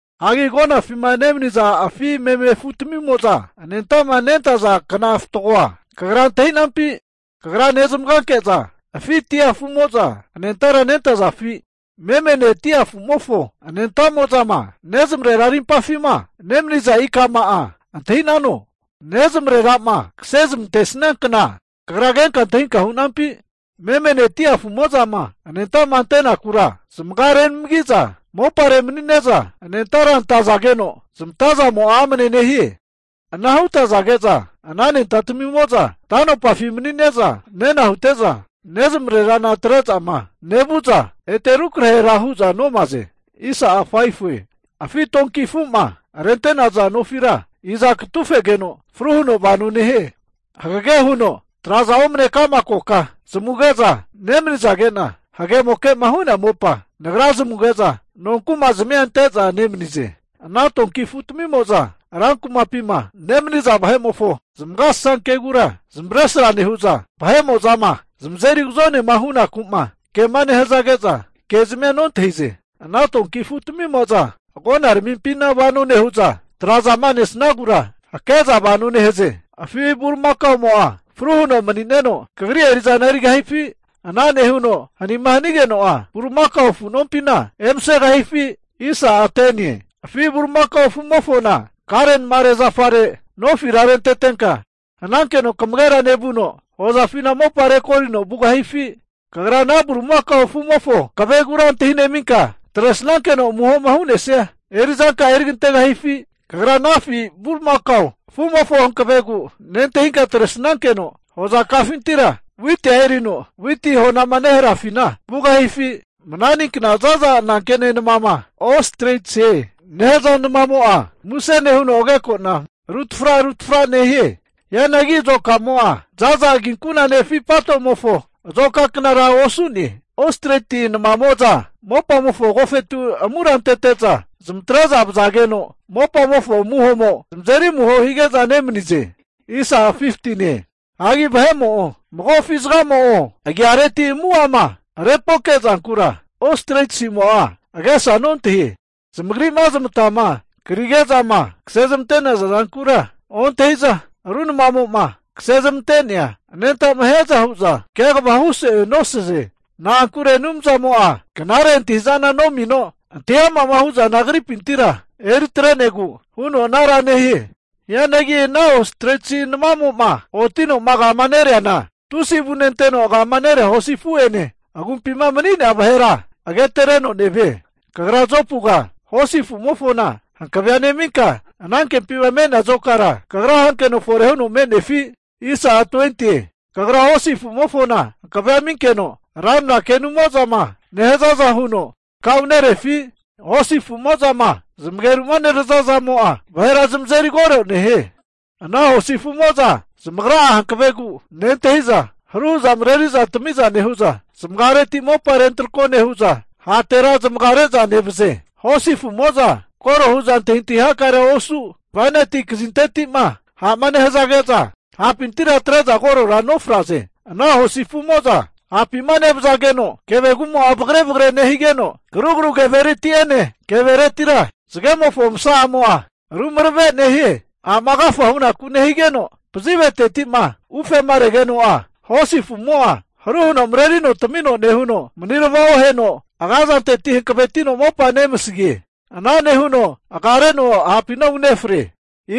Hagi agonafima nemaniza afi meme afutamimo'za anenta'ma nentaza kna fatgoa kagra antahi'nampi? Kagra nezmaganke'za afi dia afu'mo'za anentara nentazafi? Memene dia afumofo anentamo'zama nezmarera arimpafima nemaniza ikama'a antahi'nano? Nezamarera'ma kase zamantesnia kna kagra kenka antahinka hu'nampi? Memene dia afumo'zama anenta'ma antenakura, zamaga renamagi'za mopare manine'za anentara antazageno zamatazamo'a amne nehie. Ana hutazage'za ana anentatamimo'za ta'nopafi mani'ne'za nena hute'za, nezamarerana atre'zama nevu'za ete rukrahera hu'za nomaze. Afi donki afu'ma rente'naza nofira iza katufegeno fru huno vano nehie? Hagege huno tra'zama omane'nea ka'ma koka zamuge'za nemanizage'na, hagemoke'ma hu'nea mopa Nagra zamuge'za nonkuma zamia ante'za nemanize. Ana donki afutamimo'za ran kumapima nemaniza vahe'mofo zamagasasankegura zamavaresra nehu'za, vahe'mo'zama zamazeri agazonema hunaku'ma kema nehazage'za, kezmia nontahize. Ana donki afutamimo'za agonaramimpina vano nehu'za, tra'zama nesnagura hake'za vano nehaze. Afi bulimakaomo'a fru huno mani'neno kagri eri'zana erigahifi? Ana nehuno hanima hanigeno'a bulimakao afu nompina emasegahifi? Afi bulimakao afu'mofona kare namare zafare nofira rentetenka, hanankeno kamagera nevuno, hozafina mopa rekorino vugahifi? Kagra ana bulimakao afu'mofo hankavegura antahineminka, atresnankeno amuhoma hu'nesia eri'zanka'a eri kantegahifi? Kagra ana afi bulimakao afumofo hankavegu nentahinka atresnankeno, hozakafintira witia erino witi honama neharafina vugahifi? Mananinkna za'za anankene namama Ostritsie nehaza namamo'a, muse nehuno agekona rutafra tafra nehie. Hianagi azokamo'a za'za aginkunane afi patomofo azoka knara osu'ne. Ostriti namamo'za mopamofo agofetu amura antete'za zamatre'za vazageno mopamofo amuhomo zamazeri amuho hige'za nemanize. Hagi vahe'mo'o, mago afi zagamo'o agiareti amu'ama rempoke zankura Ostritsimo'a agesa nontahie. Zamagri'ma zamatama krige'zama kase zamante'naza zankura ontahi'za, ru namamo'ma kase zamante'nea anenta'ma hiaza hu'za kegavahu so'e nosaze. Na'ankure Anumzamo'a knare antahi'zana nomino, antahi ama'ma hu'zana agripintira eri atre'negu huno anara nehie. Hianagi ana Ostritsi namamo'ma otino agama nereana, tusi avune anteno agama nerea hosi afu'ene agumpima mani'nea vahera agatereno nevie. Kagra Jopuga hosi afu'mofona hankavea neminka, anankempima me'nea azokara kagra hankeno fore huno me'nefi? Kagra hosi afu'mofona hankavea aminkeno ranra kenumo'zama nehazaza huno takaunerefi? Hosi afu'mo'zama zamageru'ma nerazazamo'a vahera zamazeri koro nehie. Ana hosi afu'mo'za zamagra'a hankavegu nentahi'za, haru hu'za mareri'za tami'za nehu'za zamagareti mopa rentrako nehu'za, hatera zamagare'za nevaze. Hosi afumo'za korora hu'za antahintahi hakarea osu, bainati kazinteti'ma ha'ma nehazage'za hapintira atre'za korora nofraze. Ana hosi afumo'za hapima nevazageno kevegumo'a vagare vagare nehigeno, karugaru kevereti'ene keveretira zagemofo masamo'a rumarave nehie. Ha'ma agafa hunaku nehigeno, paziveteti'ma ufema regeno'a, hosi afumo'a haru huno marerino tamino nehuno manirava oheno, aga zanteti hankavetino mopa nemasagie. Ana nehuno agareno ha'pina unefre.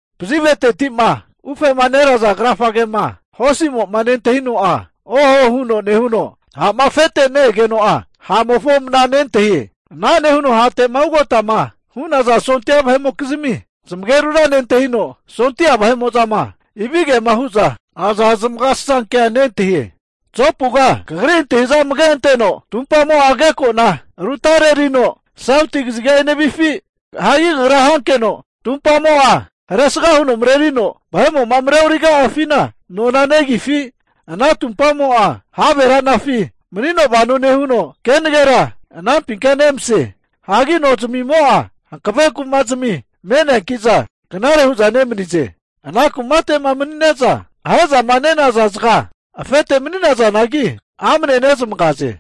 Paziveteti'ma ufema neraza krafagema hosimo'ma nentahino'a, oho huno nehuno ha'ma afete ne-egeno'a, ha'mofo mna nentahie. Ana nehuno hate'ma ugotama hu'naza sondia vahe'mokizmi zamagerura nentahino, sondia vahe'mo'zama ivigema hu'za aza zamagasasankea nentahie. Jopuga kagri antahi'za amage anteno, tumpamo'a ageko'na rutarerino sauti kaziga enevifi? Hagi kagra hankeno tumpamo'a haresga huno marerino vahe'mo'ma mareoriga'afina nona negifi? Ana tumpamo'a have ra'nafi manino vano nehuno, kenagera anampinka nemase. Hagi nozamimo'a hankave kuma'zami me'neanki'za knare hu'za nemanize. Ana kumate'ma manine'za, ahe'zama nenaza zaga afete mani'nazanagi, amne nezamagaze.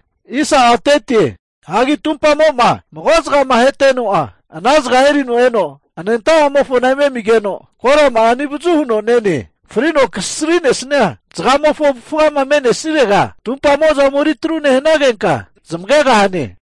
Hagi tumpamo'ma mago zagama aheteno'a, ana zaga erino eno anenta'amofona eme amigeno, korama'a anivazu huno nene. Frino kasri'nesia zagamofo avufgama me'nesirega, tumpamo'za ome atru nehanagenka zamagegahane.